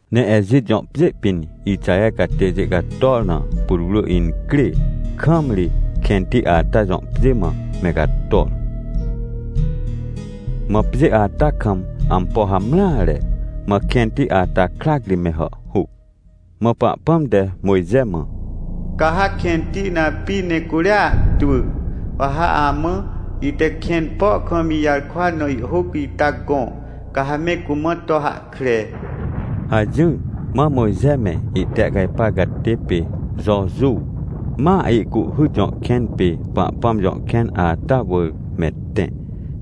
Ne Ejit jõ pjê pĩn Ixaher catêjê cator na, putwrỳincrê kam ri, kẽnti ata jõ pjêmã, me cator. Mã pjê ata kam ampo hamreare. Mãkẽnti ata krac ri me hàhhuc. Mã Pahpãm te Mojxemã: — Ca ha kẽnti na api ne curia ahtwỳ. Wa ha amã, ite kẽn po kam ijarkwa na ihhôc ita gõ, ca ha me cumã to hahkre — hajỹr. Mã Mojxe me, ihtehcajpar catê pê Jojuw, ma Ihcuhhyt jõkẽn pê Pahpãm jõ kẽn ata wỳr me tẽ.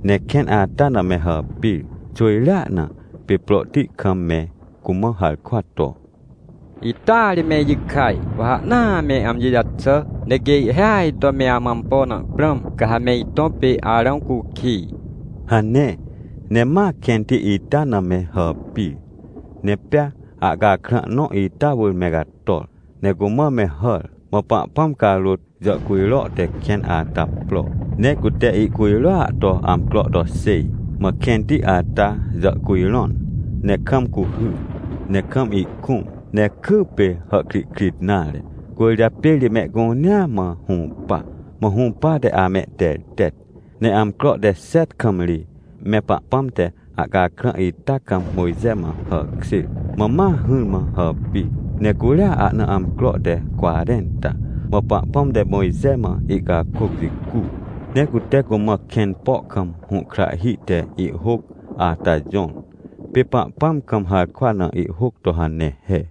Ne kẽnata na me hàpir xwỳjreana, pê prohti kam me cumã harkwa to: — Ita ri me ijikaj, wa ha ahnaa me amjijaxà. Ne quê ihhêaj to me amã ampo naprãm, ca ha me itõ pê Arãwcukij — hane. Ne ma kẽnti ita na me hàpir, ne pea ahcakrã nõ ita wỳr me cator, ne cumã me hàr. Mã Pahpãm carôt jàhcujro tekẽn ata pro, ne cute ihcujroa to amcroto xêj. Mã kẽnti ata jàhcujrõn, ne kam cuhy, ne kam ihkũm, ne kypê hàhkrihkrit nare. Cwỳrjapê ri mehcunea mã hũpa, mã hũpate amehtertet. Ne amcro te xet kam ri, me Pahpãm te ahcakrã ita kam Mojxe mã hàkjêr. Mã ma hỹrmã hàpir, ne curia ahna amcro te cwarẽnta. Mã Pahpãm te Mojxe mã ihcakôc jicu, ne cute cumã kẽn po kam hũhkrahhi te ihhôcata jõr. Pê Pahpãm kam harkwa na ihhôc to hane he.